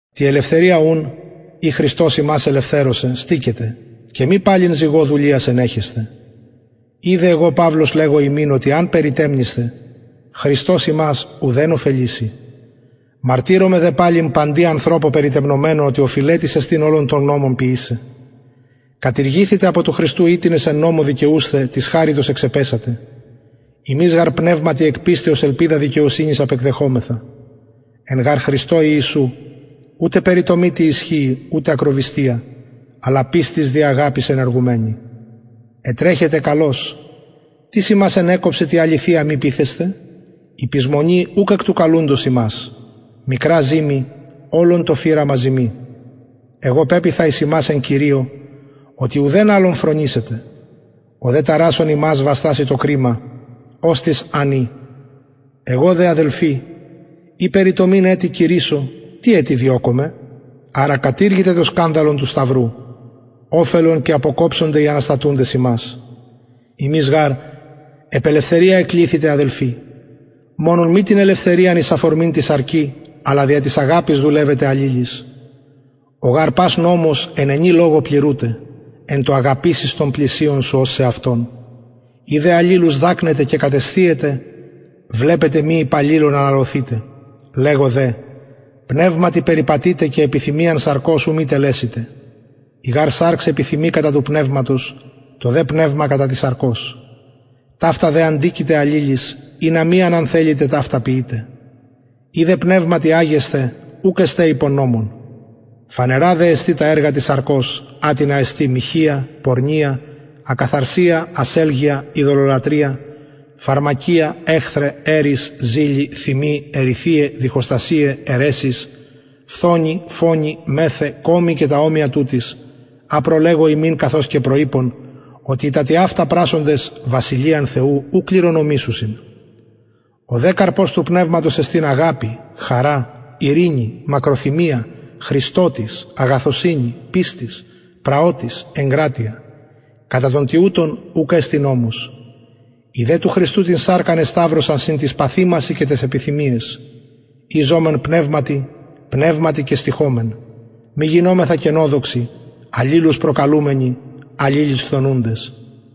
τη ελευθερια ουν η χριστος ημας ηλευθερωσεν στηκετε και μη παλιν ζυγω δουλειας ενεχεσθε ιδε εγω παυλος λεγω υμιν οτι εαν περιτεμνησθε χριστος υμας ουδεν ωφελησει μαρτυρομαι δε παλιν παντι ανθρωπω περιτεμνομενω οτι οφειλετης εστιν ολον τον νομον ποιησαι κατηργηθητε απο του χριστου οιτινες εν νομω δικαιουσθε της χαριτος εξεπεσατε ημεις γαρ πνευματι εκ πιστεως ελπιδα δικαιοσυνης απεκδεχομεθα εν γαρ χριστω ιησου ουτε περιτομη τι ισχυει ουτε ακροβυστια αλλα πιστις δι αγαπης ενεργουμενη ετρεχετε καλως τις υμας ενεκοψεν τη αληθεια μη πειθεσθαι η πεισμονη ουκ εκ του καλουντος υμας μικρα ζυμη ολον το φυραμα ζυμοι εγω πεποιθα εις υμας εν κυριω οτι ουδεν αλλο φρονησετε ο δε ταρασσων υμας βαστασει το κριμα οστις αν η εγω δε αδελφοι ει περιτομην ετι κηρυσσω τι ετι διωκομαι αρα κατηργηται το σκανδαλον του σταυρου οφελον και αποκοψονται οι αναστατουντες υμας υμεις γαρ επ ελευθερια εκληθητε αδελφοι μονον μη την ελευθεριαν εις αφορμην τη σαρκι αλλα δια της αγαπης δουλευετε αλληλοις ο γαρ πας νομος εν ενι λογω πληρουται εν τω αγαπησεις τον πλησιον σου ως εαυτον ει δε αλληλους δακνετε και κατεσθιετε βλεπετε μη υπο αλληλων αναλωθητε λεγω δε πνευματι περιπατειτε και επιθυμιαν σαρκος ου μη τελεσητε η γαρ σαρξ επιθυμει κατα του πνευματος το δε πνευμα κατα της σαρκος ταυτα δε αντικειται αλληλοις ινα μη α αν θελητε ταυτα ποιητε ει δε πνευματι αγεσθε ουκ εστε υπο νομον φανερα δε εστιν τα εργα της σαρκος ατινα εστιν μοιχεια πορνεια ακαθαρσια ασελγεια ειδωλολατρεια φαρμακεια εχθραι ερεις ζηλοι θυμοι εριθειαι διχοστασιαι αιρεσεις φθονοι φονοι μεθαι κωμοι και τα ομοια τουτοις α προλεγω υμιν καθως και προειπον οτι οι τα τοιαυτα πρασσοντες βασιλειαν θεου ου κληρονομησουσιν ο δε καρπος του πνευματος εστιν αγαπη χαρα ειρηνη μακροθυμια χρηστοτης αγαθωσυνη πιστις πραοτης εγκρατεια κατα των τοιουτων ουκ εστιν νομος οι δε του χριστου την σαρκα εσταυρωσαν συν τοις παθημασιν και ταις επιθυμιαις ει ζωμεν πνευματι πνευματι και στοιχωμεν μη γινωμεθα κενοδοξοι αλληλους προκαλουμενοι αλληλοις φθονουντες